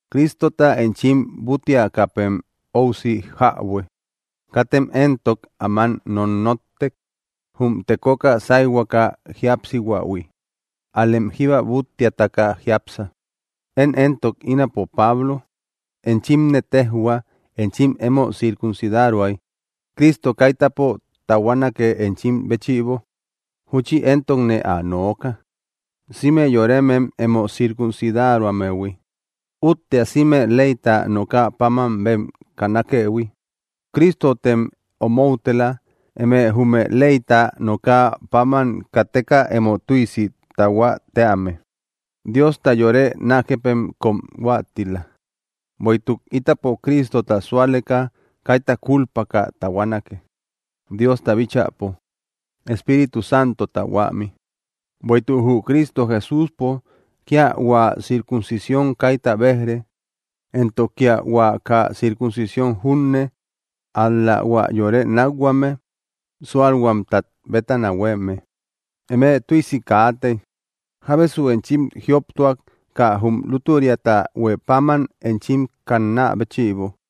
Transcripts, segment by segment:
Cristota enchim búttiakäpem óusi jäbue. Katem éntok áman nonnotte, jum tekoka sáyhuaka jíapsihuähui; ál‑lem jíba búttiataka jiápsa. Én éntok ínapo, Pablo, enchimne téjhua, enchim emo circuncidaroay Cristo kaitäpo tahuanake enchim béchïbo. Júchi éntokne ä nooka, sïme yoremem emo circuncidaroammehui, úttea sïme leyta nokä páman bem kannakëhui. Cristotem omoutela, eme jume leyta nokä páman kateka emo tüisi tahuä tíame; Diosta yore nákëpem kóm huáttila. Bueïtuk ítapo Cristota súaleka kaita kúlpaka tahuanake, Diosta bíchäpo, Espíritu Santota huämi. Bueïtuk jü Cristo Jesúspo kía hua circuncisión kaíta béj‑re, éntok kía hua kaa circuncisión junne, ál‑la hua yore nákhuame súalhuamtat bétana huéeme. Eme tüisi kaatey. ¿Jábesu enchim jioptuak, kaa jum lútüriata huë páman enchim kannä béchïbo?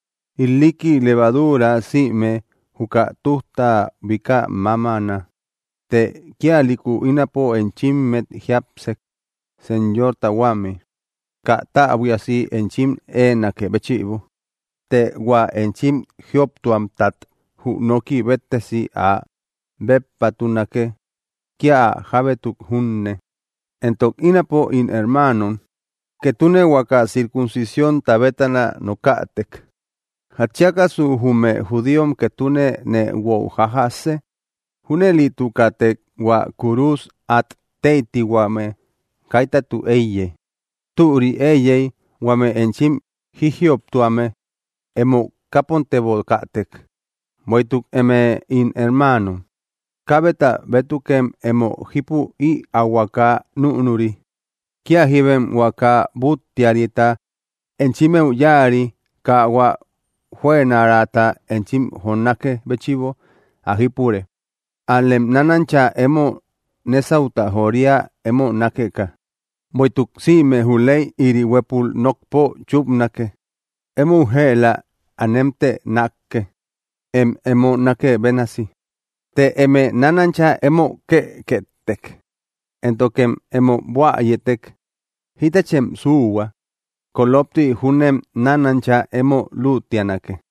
“Ilikki levaduura sïme juka tujta bika mamana.” Të kíalïku ínapo enchimmet jiápsek, Señorta huämi, kaa täbuiasi enchim éenakë béchïbo. Të hua enchim jioptuamtat jü nooki béttesi áa béppatunake, kía ä jábétuk junne. Entok ínapo, ín hermaanom, ketune huaka circuncisiónta bétana nokätek, ¿jatchiakasu jume judíom ketune nee guo jajjasë? Júnëlitukätek hua kúrus át tëitihuame kaitatü éiye. Türi éiyey, ¡huame enchim jíjioptuame emo kápontebokätek! Bueïtuk eme, ín hermaanom, kaabeta bétukem emo jípü ïaahuaka núnuri. Kía jíbem huaka búttiarita enchimmeu yáari kaa hua juënaraata enchim jonákë béchïbo ä jípure; ál‑lem nánancha emo nésauta joria emo nákeka. Bueïtuk sïme jü ley ïri huépul nokpo chúpanake: “Emou jëla anemtë nákke, em emo nákë bénasi.” Të eme nánancha emo kekkëtek éntokem emo buäyëtek, jitachem suuhua; kolopti júnem nánancha emo lütianake.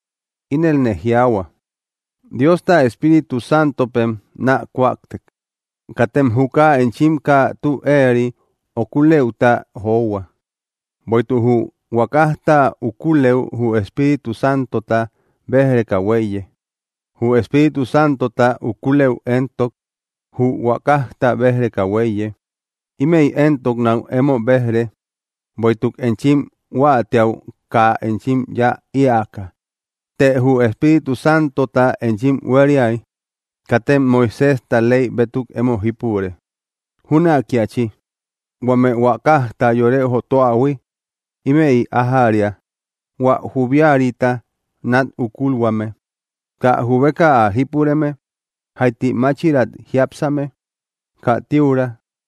Inelne jiaahua: Diosta Espíritu Santopem naa kuakte, katem juka enchim kaa tü éeri ukulëuta johua. Bueïtuk jü huakajta ukulëu jü Espíritu Santota béj‑reka huéiye; jü Espíritu Santota ukulëu éntok, jü huakajta béj‑reka huéiye. Ímëi éntok náu emo béj‑re, Bueïtuk enchim huáatiäu kaa enchim yáa ïaka. Të jü Espíritu Santota enchim huériay, katem Moiséjta ley bétuk emo jípure. Jünakiachi, huame huakajta yore jotuähui; ïmëi ájäria: hua jubiarita nat ukulhuame, kaa jubeka ä jípureme, jaiti máchirat jiápsame, kaa tíura,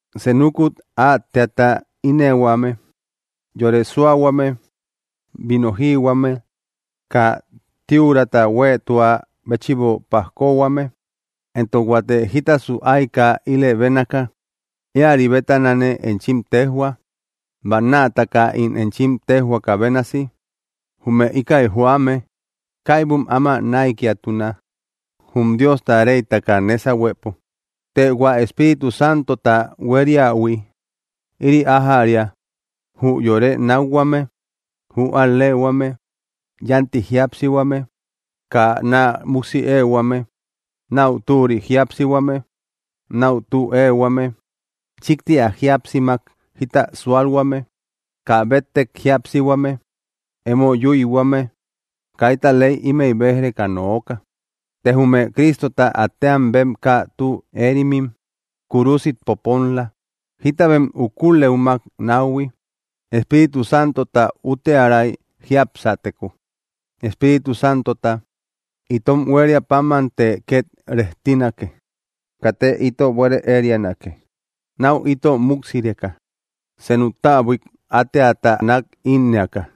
senukut átteata ínnëhuame, yore súahuame, vino jïhuame, kaa tíurata huéetua béchïbo pajkohuame, éntok huate jítasu ayka ílë bénaka; íäri bétanane enchim téjhua, bannaataka ín enchim téjhuaka bénasi, jume íkäi joame kaibum áma näikiatuna, jum Diosta reytaka nésahuepo. Të hua Espíritu Santota hueriähui, ïri ájäria: jü yore nákhuame, jü al‑lee‑huame, yánti jíapsihuame, kaa naa múksi éehuame, náu türi jíapsihuame, náu tü éehuame, chíkti ä jíapsimak jita súalhuame, kaa béttek jíapsihuame, emo yüihuame; kaita ley ímëi béj‑reka nooka. Të jume Cristota átteam bem kaa tü éerimim kúrusit poponla, jita bem ukulëumak náuhui. Espíritu Santota úttiäray jiapsäteko, Espíritu Santota itom huéria pámante ket rejtinake. Katte ito buere érianake, náu ito múksireka, senuk täbuik átteata nat innëaka.